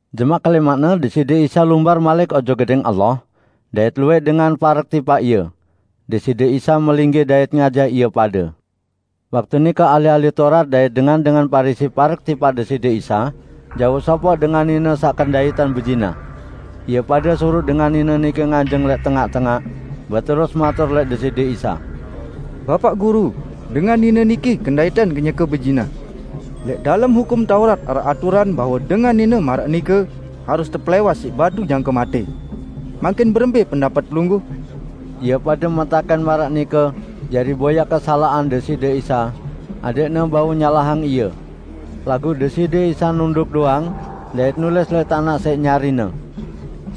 Jemaq kelẽmaqne Deside Isa lumbar malik ojok Gedẽng Allah, dait luwẽq dengan parek tipaq Ie. Deside Isa melinggih dait ngajah ie pade. Waktu nike ahli-ahli Taurat dait dengan-dengan Parisi parek tipaq Deside Isa jauq sopoq dengan nine saq kendaitan bezinah. Ie pade suruq dengan nine nike nganjeng lẽq tengaq-tengaq, beterus matur lẽq Deside Isa, "Bapaq Guru, dengan nine niki kendaitan kenyeke bezinah. Lẽq dalem Hukum Taurat araq aturan bahwe dengan nine maraq nike harus tepelẽwas siq batu jangke matẽ. Mangkin berembẽ pendapet Pelungguh?" Ie pade metakẽn maraq nike jari boyaq kesalaqan Deside Isa, adẽqne bau nyalahang Ie. Laguq Deside Isa nunduk doang dait nulis lẽq tanaq siq nyari-Ne.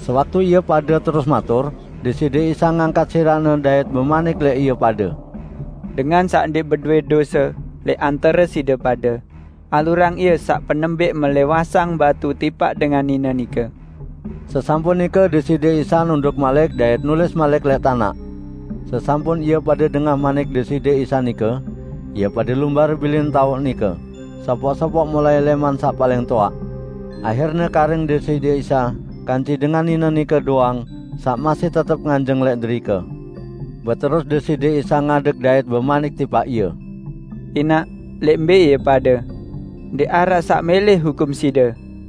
Sewaktu ie pade terus matur, Deside Isa ngangkat sirah-Ne dait bemanik lẽq ie pade, "Dengan saq ndẽq bedowẽ dose lẽq antare side pade, alurang ie saq penembẽq melẽwasang batu tipaq dengan nine nike." Sesampun nike Deside Isa nunduk malik dait nulis malik lẽq tanaq. Sesampun ie pade dengah manik Deside Isa nike, ie pade lumbar bilin taoq nike, sopoq-sopoq mulai lẽman saq paling toaq. Ahirne karing Deside Isa kance dengan nine nike doang saq masih tetep nganjeng lẽq derike. Beterus Deside Isa ngadeg dait bemanik tipaq ie, "Inaq, lẽq mbẽ ie pade? Ndẽq araq saq mẽlẽ hukum side?"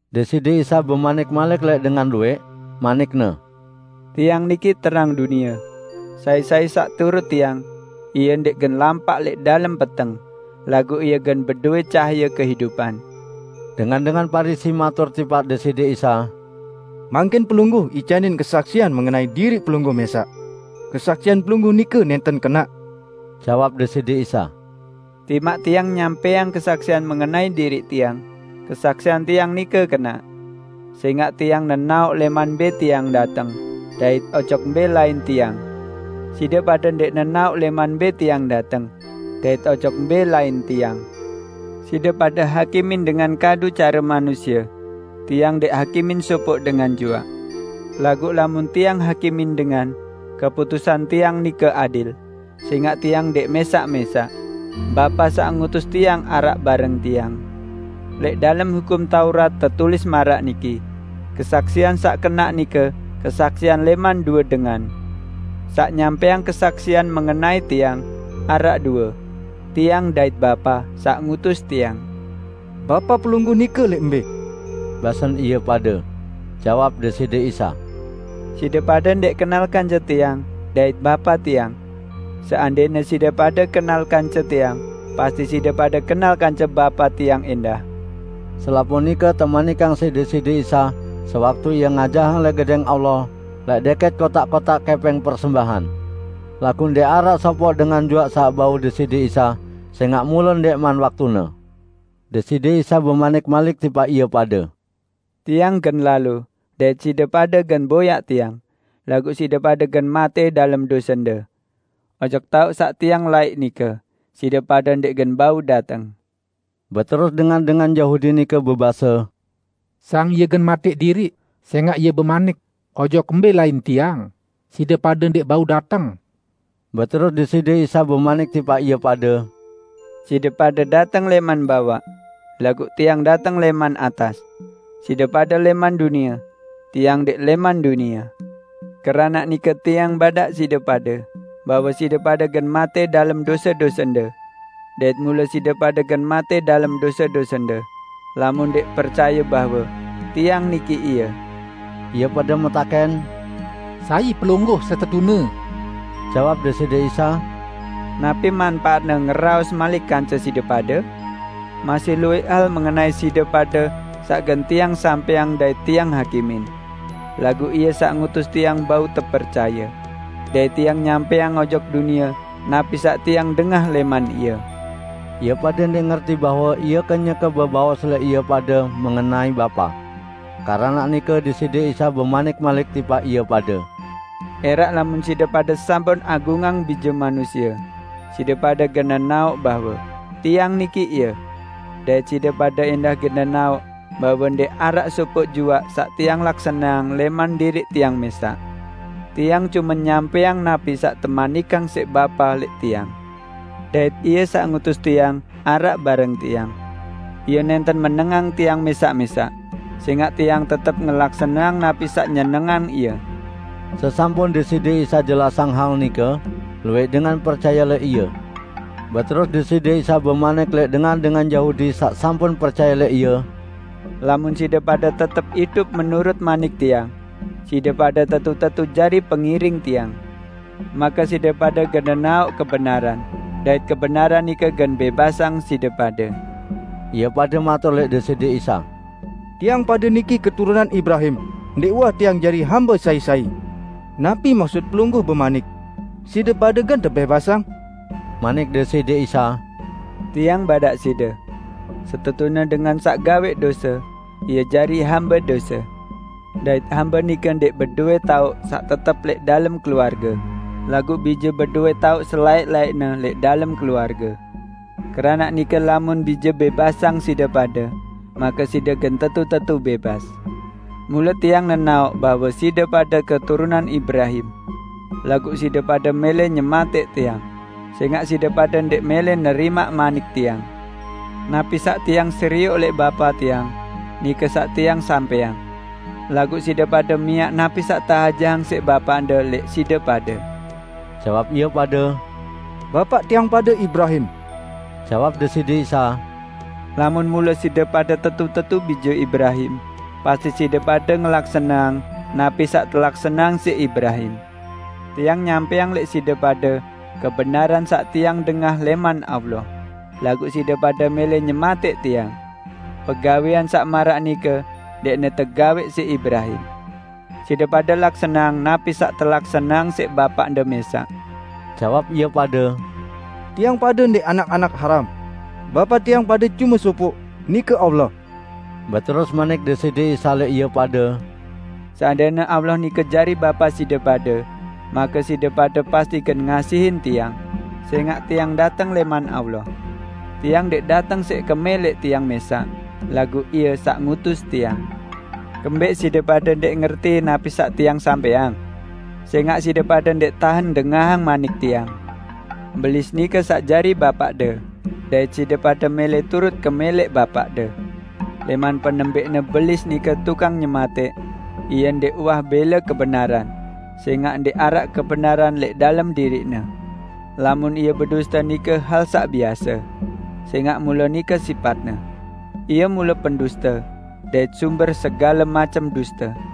Deside Isa bemanik malik lẽq dengan luwẽq, manik-Ne, "Tiang niki terang dunie; sai-sai saq turut Tiang, ie ndẽq gen lampaq lẽq dalem peteng, laguq ie gen bedowẽ cahaye kehidupan." Dengan-dengan Parisi matur tipaq Deside Isa, "Mangkin Pelungguh icanin kesaksian mengenai diriq Pelungguh mẽsaq. Kesaksian Pelungguh nike nẽnten kenaq." Jawab Deside Isa, "Timaq Tiang nyampẽang kesaksian mengenai diriq Tiang, kesaksian Tiang nike kenaq; sẽngaq Tiang nenaoq lẽman mbẽ Tiang dateng, dait ojok mbẽ lain Tiang. Side pade ndẽq nenaoq lẽman mbẽ Tiang dateng, dait ojok mbẽ lain Tiang. Side pade hakimin dengan kadu care manusie; Tiang ndẽq hakimin sopoq dengan juaq. Laguq lamun Tiang hakimin dengan, keputusan Tiang nike adil, sẽngaq Tiang ndẽq mẽsaq-mẽsaq; Bapa saq ngutus Tiang araq bareng Tiang. Lẽq dalem Hukum Taurat tetulis maraq niki: Kesaksian saq kenaq nike kesaksian lẽman due dengan. Saq nyampẽang kesaksian mengenai Tiang, araq due -- Tiang, dait Bapa, saq ngutus Tiang." "Bapa Pelungguh nike lẽq mbẽ?" basen ie pade. Jawab Deside Isa, "Side pade ndẽq kenal kance Tiang dait Bapa Tiang. Seandẽne side pade kenal kance Tiang, pasti side pade kenal kance Bapa Tiang ẽndah." Selapuq nike temanikang siq Deside Isa sewaktu Ie ngajahang lẽq Gedẽng Allah lẽq dẽkẽt kotaq-kotaq kẽpẽng persembahan. Laguq ndẽq araq sopoq dengan juaq saq bau Deside Isa, sẽngaq mule ndẽqman waktune. Deside Isa bemanik malik tipaq ie pade, "Tiang gen lalo, dait side pade gen boyaq Tiang, laguq side pade gen matẽ dalem dosende. Ojok taoq saq Tiang laiq nike side pade ndẽq gen bau dateng." Beterus dengan-dengan Yahudi nike bebase, "Sang Ie gen matẽq diriq, sẽngaq Ie bemanik, 'Ojok mbẽ lain Tiang, side pade ndẽq bau dateng.' " Beterus Deside Isa bemanik tipaq ie pade, "Side pade dateng lẽman bawaq; laguq Tiang dateng lẽman atas. Side pade lẽman dunie; Tiang ndẽq lẽman dunie. Keranaq nike Tiang badaq side pade, bahwe side pade gen matẽ dalem dose-dosende. Dait mule side pade gen matẽ dalem dose-dosende, lamun ndẽq percaye bahwe 'Tiang niki Ie'." Ie pade metakẽn, "Sai Pelungguh setetune?" Jawab Deside Isa, "Napi manpaatne ngeraos malik kance side pade? Masih luwẽq hal mengenai side pade saq gen Tiang sampẽang dait Tiang hakimin. Laguq Ie saq ngutus Tiang bau tepercaye. Dait Tiang nyampẽang ojok dunie napi saq Tiang dengah lẽman Ie." Ie pade ndẽq ngerti bahwe Ie kenyeke bebaos lẽq ie pade mengenai Bapa. Keranaq nike Deside Isa bemanik malik tipaq ie pade, "~Eraq lamun side pade sampun agungang Bije Manusie, side pade gen nenaoq bahwe 'Tiang niki Ie', dait side pade ẽndah gen nenaoq bahwe ndẽq araq sopoq juaq saq Tiang laksaneang lẽman diriq Tiang mẽsaq. Tiang cume nyampẽang napi saq temanikang siq Bapa lẽq Tiang. Dait Ie saq ngutus Tiang araq bareng Tiang. Ie nẽnten menengang Tiang mẽsaq-mẽsaq, sẽngaq Tiang tetep ngelaksaneang napi saq nyenengang Ie." Sesampun Deside Isa jelasang hal nike, luwẽq dengan percaye lẽq Ie. Beterus Deside Isa bemanik lẽq dengan-dengan Yahudi saq sampun percaye lẽq Ie, "Lamun side pade tetep idup menurut manik Tiang, side pade tetu-tetu jari pengiring Tiang, make side pade gen nenaoq kebenaran, dait kebenaran nike gen bẽbasang side pade." Ie pade matur lẽq Deside Isa, "Tiang pade niki keturunan Ibrahim, ndẽq uwah tiang jari hambe sai-sai! Napi maksut Pelungguh bemanik, 'Side pade gen tebẽbasang'?" Manik Deside Isa, "Tiang badaq side: Setetune dengan saq gawẽq dose, ie jari hambe dose. Dait hambe nike ndẽq bedowẽ taoq saq tetep lẽq dalem keluarge, laguq bije bedowẽ taoq selaẽq-laẽqne lẽq dalem keluarge. Keranaq nike lamun Bije bẽbasang side pade, make side gen tetu-tetu bẽbas. Mule Tiang nenaoq bahwe side pade keturunan Ibrahim. Laguq side pade mẽlẽ nyematẽq Tiang, sẽngaq side pade ndẽq mẽlẽ nerimaq manik Tiang. Napi saq Tiang serioq lẽq Bapa Tiang, nike saq Tiang sampẽang. Laguq side pade miaq napi saq teajahang siq bapaqde lẽq side pade." Jawab ie pade, "Bapaq tiang pade Ibrahim." Jawab Deside Isa, "Lamun mule side pade tetu-tetu bije Ibrahim, pasti side pade ngelaksaneang napi saq telaksaneang siq Ibrahim. Tiang nyampẽang lẽq side pade kebenaran saq Tiang dengah lẽman Allah, laguq side pade mẽlẽ nyematẽq Tiang. Pegawẽan saq maraq nike ndẽqne tegawẽq siq Ibrahim! Side pade laksaneang napi saq telaksaneang siq bapaqde mẽsaq." Jawab ie pade, "Tiang pade ndẽq anak-anak haram. Bapa tiang pade cume sopoq, nike Allah." Beterus manik Deside Isa lẽq ie pade, "Seandẽne Allah nike jari Bapa side pade make side pade pasti gen ngasihin Tiang, sẽngaq Tiang dateng lẽman Allah. Tiang ndẽq dateng siq kemẽlẽq Tiang mẽsaq, laguq Ie saq ngutus Tiang. Kembẽq side pade ndẽq ngerti napi saq Tiang sampẽang? Sẽngaq side pade ndẽq tahen dengahang manik Tiang. Belis nike saq jari bapaqde, dait side pade mẽlẽ turut kemẽlẽq bapaqde. Lẽman penembẽqne Belis nike tukang nyematẽq. Ie ndẽq uwah bẽle kebenaran, sẽngaq ndẽq araq kebenaran lẽq dalem diriqne. Lamun ie beduste nike hal saq biase, sẽngaq mule nike sipatne. Ie mule penduste dait sumber segale macem duste.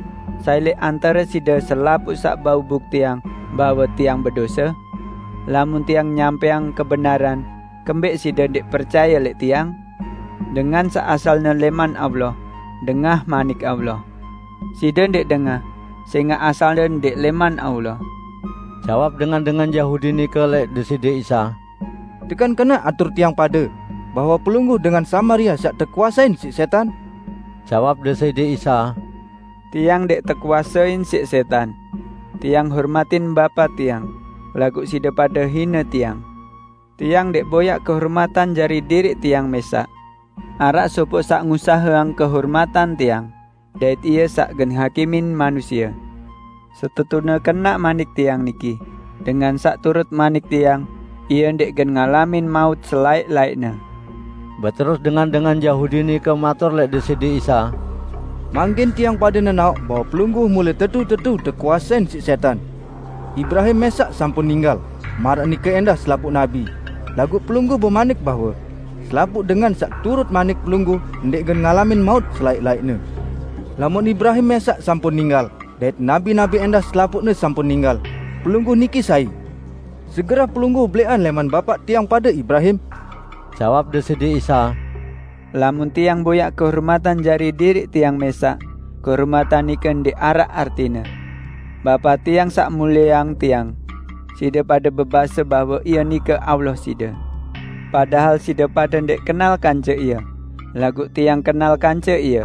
Sai lẽq antare side selapuq saq bau buktiang bahwe Tiang bedose? Lamun Tiang nyampẽang kebenaran, kembẽq side ndẽq percaye lẽq Tiang? Dengan saq asalne lẽman Allah, dengah Manik Allah. Side ndẽq dengah sẽngaq asalde ndẽq lẽman Allah." Jawab dengan-dengan Yahudi nike lẽq Deside Isa, "Tekan kenaq atur tiang pade bahwe Pelungguh dengan Samaria saq tekuasein siq sẽtan?" Jawab Deside Isa, "Tiang ndẽq tekuasein siq sẽtan. Tiang hormatin Bapa Tiang, laguq side pade hine Tiang. Tiang ndẽq boyaq kehormatan jari diriq Tiang mẽsaq. Araq sopoq saq ngusaheang kehormatan Tiang, dait Ie saq gen hakimin manusie. Setetune kenaq manik Tiang niki, dengan saq turut manik Tiang, ie ndẽq gen ngalamin maut selaẽq-laẽqne." Beterus dengan-dengan Yahudi nike matur lẽq Deside Isa, "Mangkin tiang pade nenaoq bahwe Pelungguh mule tetu-tetu tekuasein siq sẽtan! Ibrahim mẽsaq sampun ninggal, maraq nike ẽndah selapuq nabi, laguq Pelungguh bemanik bahwe, 'Selapuq dengan saq turut manik Pelungguh ndẽq gen ngalamin maut selaẽq-laẽqne.' Lamun Ibrahim mẽsaq sampun ninggal, dait nabi-nabi ẽndah selapuqne sampun ninggal, Pelungguh niki sai? Segerah Pelungguh belẽqan lẽman bapaq tiang pade Ibrahim!" Jawab Deside Isa, "Lamun Tiang boyaq kehormatan jari diriq Tiang mẽsaq, kehormatan nike ndẽq araq artine. Bapa Tiang saq mulieang Tiang. Side pade bebase bahwe Ie nike Allah side, padahal side pade ndẽq kenal kance Ie, laguq Tiang kenal kance Ie.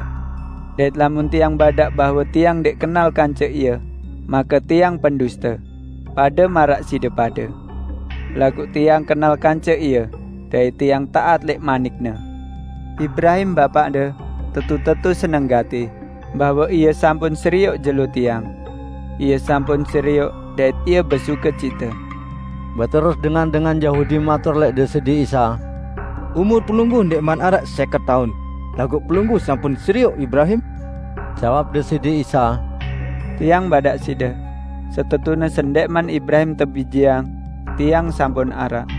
Dait lamun Tiang badaq bahwe Tiang ndẽq kenal kance Ie, make Tiang penduste, pade maraq side pade. Laguq Tiang kenal kance Ie dait Tiang taat lẽq manik-Ne. Ibrahim, bapaqde tetu-tetu seneng gati bahwe ie sampun serioq jelo Tiang. Ie sampun serioq, dait ie besukecite!" Beterus dengan-dengan Yahudi matur lẽq Deside Isa, "Umur Pelungguh ndẽqman araq sẽket taun, laguq Pelungguh sampun serioq Ibrahim?" Jawab Deside Isa, "Tiang badaq side, bahwe setetune sendẽqman Ibrahim tebijeang, Tiang sampun araq."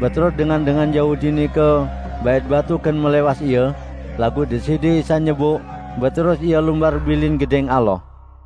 Beterus dengan-dengan Yahudi nike bait batu gen melẽwas Ie; laguq Deside Isa nyeboq, beterus Ie lumbar bilin Gedẽng Allah.